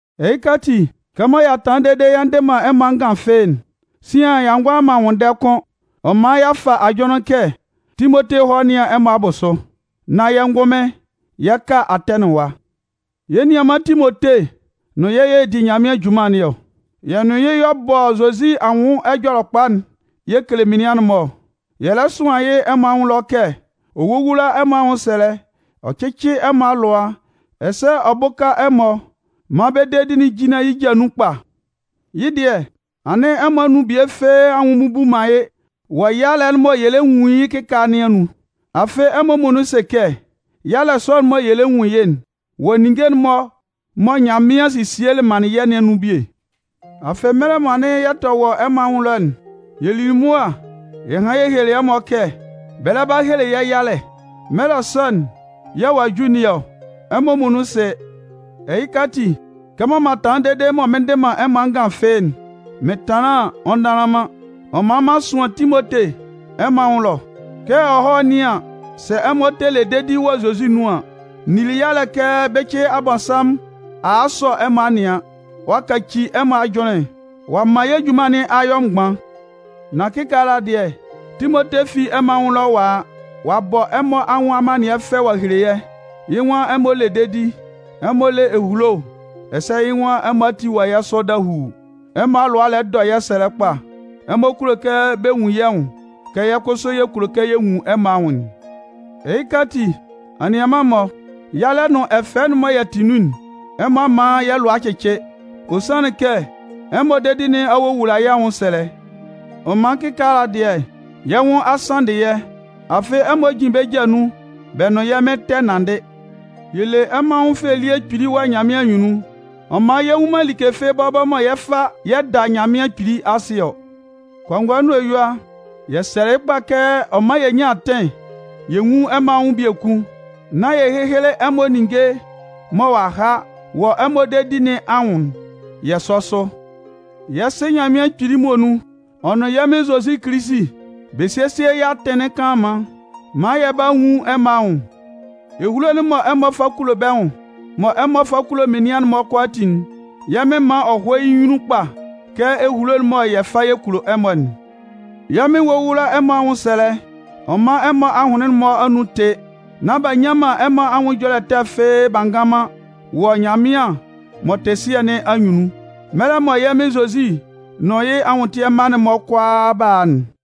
Ɛhɩka ati, kɛmɔ y'a tanlan dede yɛ ndɩ man ɛmɔ angan fɩ́ɩ́'n, sian y'a ngʋala man nwʋnndɛ kʋ́n. Ɔ man y'a fa ajʋnlɩn kɛ Timote hɔ́ nɩ́an ɛmɔ abʋsʋ, nán yɛ́ ngʋnmɩn yɛ ka Atɛnɩn ɛwa. Yɛ́ nianman Timote nʋn yɛ́ y'ɔ di Nyanmɩan junman nɩn ɔ. Yɛ́ nʋn yɩ́ y'ɔ bɔ Zozi anwʋn Ɛjɔlɛkpa'n yɛ kele menian'n-mɔ ɔ. Yɛ lɛ sʋan yɩ́ ɛmɔ anwʋn ɛlɔ kɛ ɔ wówula ɛmɔ anwʋnsɛlɛ, ɔ cɩ́cɩ ɛmɔ alʋa, ɛsɛ ɔ bʋ́ka ɛmɔ maan bɛ́ dedi'n jínlan yɩ́ ja nun kpa. Yɩ́ dɩɛ, anɩn ɛmɔ anun bie fɩ́ɩ́ anwʋn a mmubu man yɩ́ wɔ yalɛ'n mɔ yɛ lɛ nwun yɩ́ kɩkaala nɩn anun. Afɩ ɛmɔ muonun sɩ kɛ yalɛ sɔ'n mɔ yɛ lɛ nwun yɩ́'n wɔ ninnge'n-mɔ mɔ Nyanmɩan sesielɩ manlɩn yɛ́ nɩn anun bie. Afɩ mɛlɛ mɔ anɩn yɛ tɛ wɔ ɛmɔ anwʋn ɛlɔ'n, yɛ lili mʋa yɛ hanlɩn yɛ helelɩ ɛmɔ kɛ bɛ lɛ ba hele yɛ́ yalɛ. Mɛlɛ sɔ'n yɛ̂ ɔ'a ju nɩn ɔ, ɛmɔ muonun sɩ. Ɛhɩka ati, kɛmɔ m'an tanlan dede mɔ mɩn ndɩ man ɛmɔ angan fɩ́ɩ́'n, mɩn tanlan an, ɔ ndanlan man. Ɔ man m'an sʋan Timote ɛmɔ anwʋn ɛlɔ, kɛ ɔ hɔ́ nɩ́an sɛ ɛmɔ tɛ le dedi wɔ Zozi nun an. N nili yalɛ kɛ bɩcɩ Abɔnsanmʋn a a a sɔ ɛmɔ a nɩan, ɔ'a kaci ɛmɔ ajʋnlɩn, ɔ'a man yɛ́ junman nɩn a yɔ mgban. Nan kɩkaala dɩɛ, Timote fi ɛmɔ anwʋn ɛlɔ ɔ'a a. Ɔ'a bɔ ɛmɔ anwʋn amannɩɛ fɛ ɔ'a hele yɛ́. Yɩ́ nwan ɛmɔ le dedi, ɛmɔ le ehulo, ɛsɛ yɩ́ nwan ɛmɔ ati wɔ yɛ́ sʋ dahuu, ɛmɔ alʋa lɛ dɔ yɛ́ sɛlɛ kpa, ɛmɔ kulo kɛ bɛ nwun yɛ́ nwʋn kɛ yɛ́ kʋsʋ yɛ kulo kɛ yɛ nwun ɛmɔ anwʋn'n. Ɛhɩka ati, anianman-mɔ, yalɛ nʋn ɛfɛ'n mɔ yɛ tɩ nun'n, ɛmɔ a man yɛ́ lʋa a cɩcɩ. Ɔ sanlɩn kɛ ɛmɔ dedi nɩn a wowula yɛ́ anwʋnsɛlɛ. Ɔ man kɩkaala dɩɛ, yɛ́ nwʋn a sanndɩ yɛ́, afɩ ɛmɔ jin bɛ́ ja nun bɛ nʋn yɛ́ Mɩn tɛ nanndɩ. Yɛ le ɛmɔ anwʋn fɛ elie kpili wɔ Nyanmɩan anyunnun, ɔ man yɛ nnwun man like fɩ́ɩ́ bɔbɔ mɔ yɛ 'fa yɛ 'da Nyanmɩan Kpili asɩ ɔ. Kɔngɔɛ nʋn eyua, yɛ sɛlɛ yɩ́ kpa kɛ ɔ mán yɛ nyán atɩn yɛ nwún ɛmɔ anwʋn biekun, nán yɛ héhele ɛmɔ ninnge mɔ ɔ'a ha wɔ ɛmɔ dedi nɩn anwʋn'n yɛ sɔ́ sʋ. Yɛ́ Sɩ Nyanmɩan Kpili muonun, ɔ nʋn yɛ́ Mɩn Zozi Kilisi, bɛ sésie yɛ́ atɩn kanlanman maan yɛ bála nwun ɛmɔ anwʋn. Ehulo'n mɔ ɛmɔ kulo bɛ́ nwʋn, mɔ ɛmɔ fa kulo menian'n-mɔ kʋalaatin'n, yɛ́ Mɩn mán ɔ hɔ́ yɩ́ nyunnun kpa kɛ ehulo'n mɔ yɛ fa yɛ kulo ɛmɔ'n. Yɛ́ Mɩn wówula ɛmɔ anwʋnsɛlɛ ɔ mán ɛmɔ ahʋnlɩn'n-mɔ anun tɩ́, nán b'a nnyan ɛmɔ anwʋn ɛjɔlɛ ɛtɛ fɩ́ɩ́ b'a ngan man wɔ Nyanmɩan m'ɔ tɩ Sɩɛ nɩn anyunnun, mɛlɛ mɔ yɛ́ Mɩn Zozi nʋn yɩ́ anwʋntɩɛ mma'n-mɔ kʋalaa 'ba a'n.